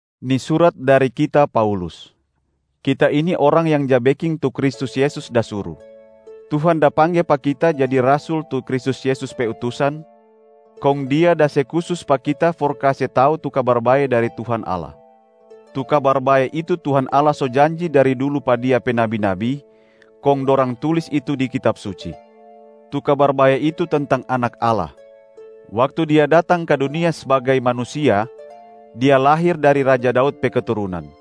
Ni surat dari kita, Paulus. Kita ini orang yang ja beking tu Kristus Yesus da suru. Tuhan da pangge pa kita jadi rasul tu Kristus Yesus pe utusan, kong Dia da se kusus pa kita for kase tau tu Kabar Bae dari Tuhan Allah. Tu Kabar Bae itu Tuhan Allah so janji dari dulu pa Dia pe nabi-nabi, kong dorang tulis itu di Kitab Suci. Tu Kabar Bae itu tentang Anak Allah. Waktu Dia datang ka dunia sbagai manusia, Dia lahir dari raja Daud pe keturunan.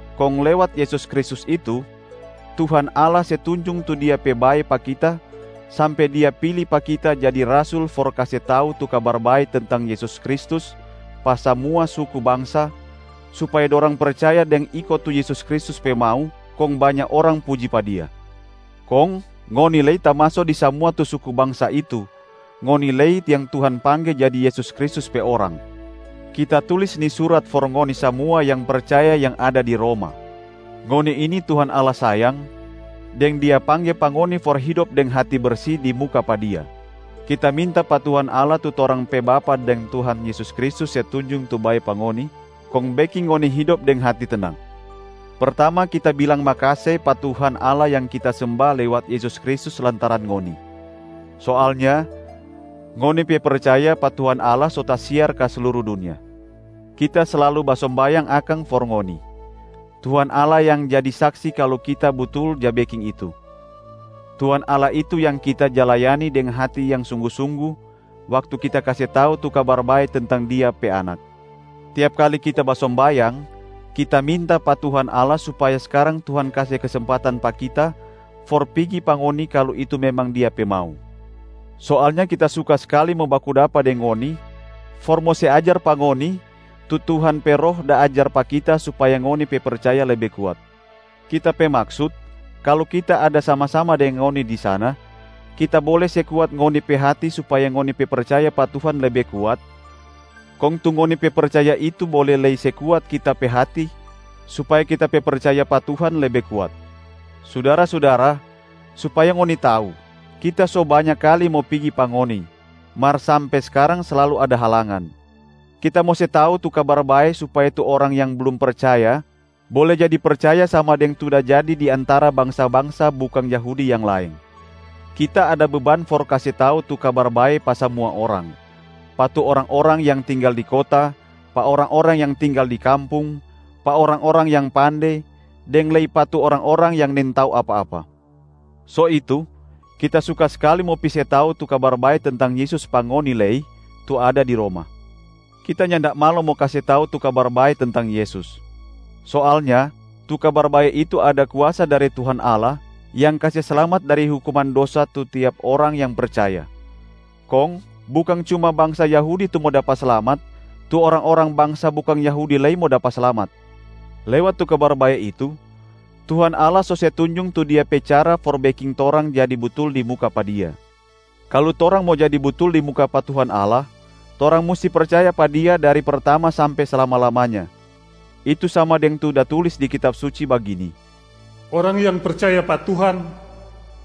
Kong lewat Yesus Kristus itu, Tuhan Allah se tunjung tu Dia pe bae pa kita sampe Dia pili pa kita jadi rasul for kase tau tu Kabar Bae tentang Yesus Kristus pa samua suku bangsa, supaya dorang percaya deng iko tu Yesus Kristus pe mau, kong banya orang puji pa Dia. Kong ngoni lei tamaso di samua tu suku bangsa itu, ngoni lei yang Tuhan pangge jadi Yesus Kristus pe orang. Kita tulis ni surat for ngoni samua yang percaya yang ada di Roma. Ngoni ini Tuhan Allah sayang, deng Dia pangge pa ngoni for hidop deng hati bersi di muka pa Dia. Kita minta pa Tuhan Allah tu torang pe Bapa deng Tuhan Yesus Kristus se tunjung tu bae pa ngoni, kong beking ngoni hidop deng hati tenang. Pertama kita bilang makase pa Tuhan Allah yang kita semba lewat Yesus Kristus lantaran ngoni. Soalnya ngoni pe percaya pa Tuhan Allah so tasiar ka sluru dunia. Kita slalu basombayang akang for ngoni; Tuhan Allah yang jadi saksi kalu kita butul ja beking itu. Tuhan Allah itu yang kita ja layani deng hati yang sunggu-sunggu waktu kita kase tau tu Kabar Bae tentang Dia pe Anak. Tiap kali kita basombayang, kita minta pa Tuhan Allah supaya skarang Tuhan kase kesempatan pa kita for pigi pa ngoni kalu itu memang Dia pe mau. Soalnya kita suka skali mo baku dapa deng ngoni for mo se ajar pa ngoni tu Tuhan pe Roh da ajar pa kita supaya ngoni pe percaya lebe kuat. Kita pe maksut, kalu kita ada sama-sama deng ngoni di sana, kita bole se kuat ngoni pe hati supaya ngoni pe percaya pa Tuhan lebe kuat, kong tu ngoni pe percaya itu bole lei se kuat kita pe hati supaya kita pe percaya pa Tuhan lebe kuat. Sudara-sudara, supaya ngoni tau, kita so banya kali mo pigi pa ngoni, mar sampe skarang slalu ada halangan. Kita mo se tau tu Kabar Bae supaya tu orang yang blum percaya bole jadi percaya sama deng tu da jadi di antara bangsa-bangsa bukang Yahudi yang laeng. Kita ada beban for kase tau tu Kabar Bae pa samua orang: pa tu orang-orang yang tinggal di kota, pa orang-orang yang tinggal di kampung, pa orang-orang yang pande, deng lei pa tu orang-orang yang nintau apa-apa. So itu, kita suka skali mo pi se tau tu Kabar Bae tentang Yesus pa ngoni lei tu ada di Roma. Kita nyanda malo mo kase tau tu Kabar Bae tentang Yesus. Soalnya tu Kabar Bae itu ada kuasa dari Tuhan Allah yang kase slamat dari hukuman dosa tu tiap orang yang percaya. Kong bukang cuma bangsa Yahudi tu mo dapa slamat, tu orang-orang bangsa bukang Yahudi lei mo dapa slamat. Lewat tu Kabar Bae itu, Tuhan Allah so se tunjung tu Dia pe cara for beking torang jadi butul di muka pa Dia. Kalu torang mo jadi butul di muka pa Tuhan Allah, torang musti percaya pa Dia dari pertama sampe slama-lamanya. Itu sama deng tu da tulis di Kitab Suci bagini, “Orang yang percaya pa Tuhan,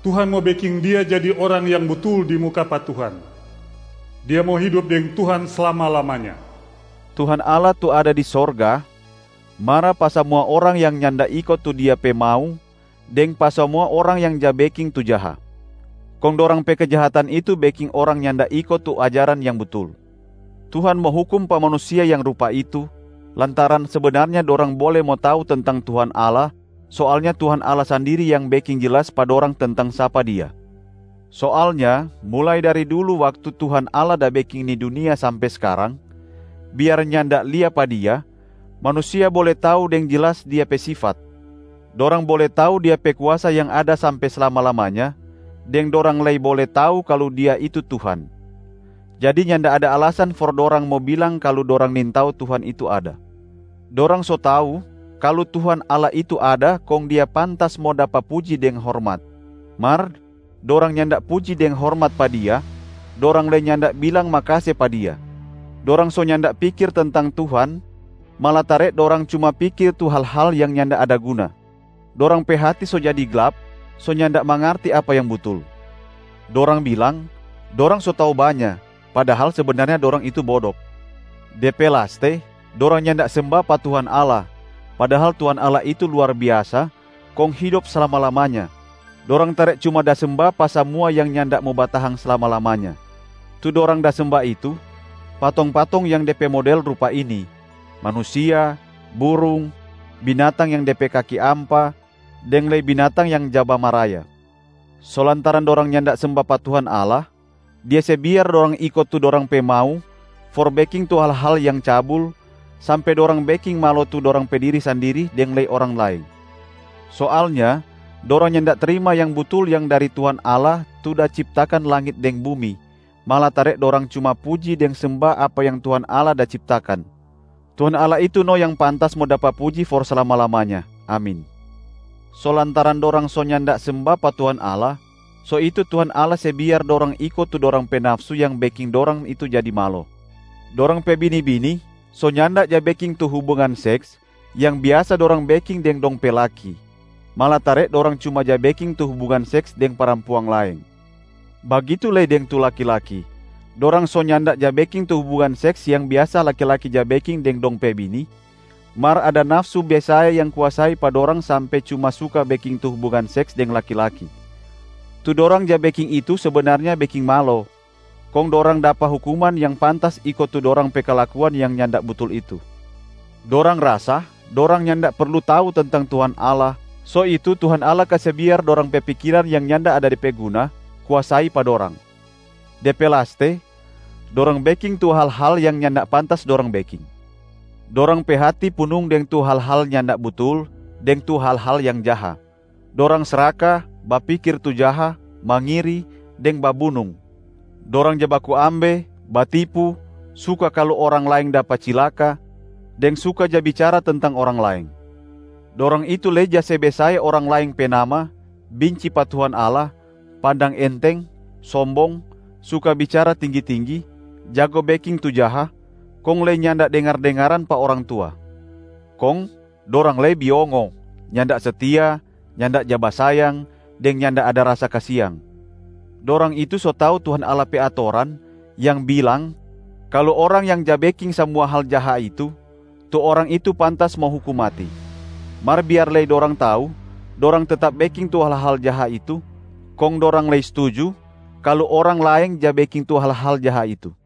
Tuhan mo beking dia jadi orang yang butul di muka pa Tuhan, dia mo hidop deng Tuhan slama-lamanya.” Tuhan Allah tu ada di sorga mara pa samua orang yang nyanda iko tu Dia pe mau deng pa samua orang yang ja beking tu jaha. Kong dorang pe kejahatan itu beking orang nyanda iko tu ajaran yang butul. Tuhan mo hukum pa manusia yang rupa itu lantaran sebenarnya dorang bole mo tau tentang Tuhan Allah, soalnya Tuhan Allah sandiri yang beking jelas pa dorang tentang sapa Dia. Soalnya mulai dari dulu waktu Tuhan Allah da beking ni dunia sampe skarang, biar nyanda lia pa Dia, manusia bole tau deng jelas Dia pe sifat. Dorang bole tau Dia pe kuasa yang ada sampe slama-lamanya, deng dorang lei bole tau kalu Dia itu Tuhan. Jadi nyanda ada alasan for dorang mo bilang kalu dorang nintau Tuhan itu ada. Dorang so tau kalu Tuhan Allah itu ada kong Dia pantas mo dapa puji deng hormat, mar dorang nyanda puji deng hormat pa Dia, dorang lei nyanda bilang makase pa Dia. Dorang so nyanda pikir tentang Tuhan malatare dorang cuma pikir tu hal-hal yang nyanda ada guna. Dorang pe hati so jadi glap, so nyanda mangarti apa yang butul. Dorang bilang, dorang so tau banya, padahal sebenarnya dorang itu bodok. De pe laste dorang nyanda semba pa Tuhan Allah, padahal Tuhan Allah itu luar biasa kong hidop slama-lamanya. Dorang tare cuma da semba pa samua yang nyanda mo batahang slama-lamanya. Tu dorang da semba itu, patong-patong yang de pe model rupa ini: manusia, burung, binatang yang de pe kaki ampa, deng lei binatang yang ja bamaraya. So lantaran dorang nyanda semba pa Tuhan Allah, Dia se biar dorang iko tu dorang pe mau for beking tu hal-hal yang cabul, sampe dorang beking malo tu dorang pe diri sandiri deng lei orang laeng. Soalnya dorang nyanda trima yang butul yang dari Tuhan Allah tu da ciptakan langit deng bumi, malatare dorang cuma puji deng semba apa yang Tuhan Allah da ciptakan. Tuhan Allah itu no yang pantas mo dapa puji for slama-lamanya. Amin. So lantaran dorang so nyanda semba pa Tuhan Allah, so itu Tuhan Allah se biar dorang iko tu dorang pe nafsu yang beking dorang itu jadi malo. Dorang pe bini-bini so nyanda ja beking tu hubungan seks yang biasa dorang beking deng dong pe laki, malatare dorang cuma ja beking tu hubungan seks deng parampuang laeng. Bagitu lei deng tu laki-laki, dorang so nyanda ja beking tu hubungan seks yang biasa laki-laki ja beking deng dong pe bini, mar ada nafsu besae yang kuasai pa dorang sampe cuma suka beking tu hubungan seks deng laki-laki. Tu dorang ja beking itu sebenarnya beking malo, kong dorang dapa hukuman yang pantas iko tu dorang pe kalakuan yang nyanda butul itu. Dorang rasa dorang nyanda perlu tau tentang Tuhan Allah, so itu Tuhan Allah kase biar dorang pe pikiran yang nyanda ada de pe guna kuasai pa dorang. De pe laste, dorang beking tu hal-hal yang nyanda pantas dorang beking. Dorang pe hati punung deng tu hal-hal nyanda butul deng tu hal-hal yang jaha. Dorang sraka, bapikir tu jaha, mangiri, deng babunung. Dorang ja baku ambe, batipu, suka kalu orang laeng dapa cilaka, deng suka ja bicara tentang orang laeng. Dorang itu lei ja se besae orang laeng pe nama, binci pa Tuhan Allah, pandang enteng, sombong, suka bicara tinggi-tinggi, jago beking tu jaha, kong lei nyanda dengar-dengaran pa orang tua. Kong dorang lei biongo, nyanda setia, nyanda ja basayang, deng nyanda ada rasa kasiang. Dorang itu so tau Tuhan Allah pe atoran yang bilang kalu orang yang ja beking samua hal jaha itu, tu orang itu pantas mo hukum mati. Mar biar lei dorang tau, dorang tetap beking tu hal-hal jaha itu, kong dorang lei stuju kalu orang laeng ja beking tu hal-hal jaha itu.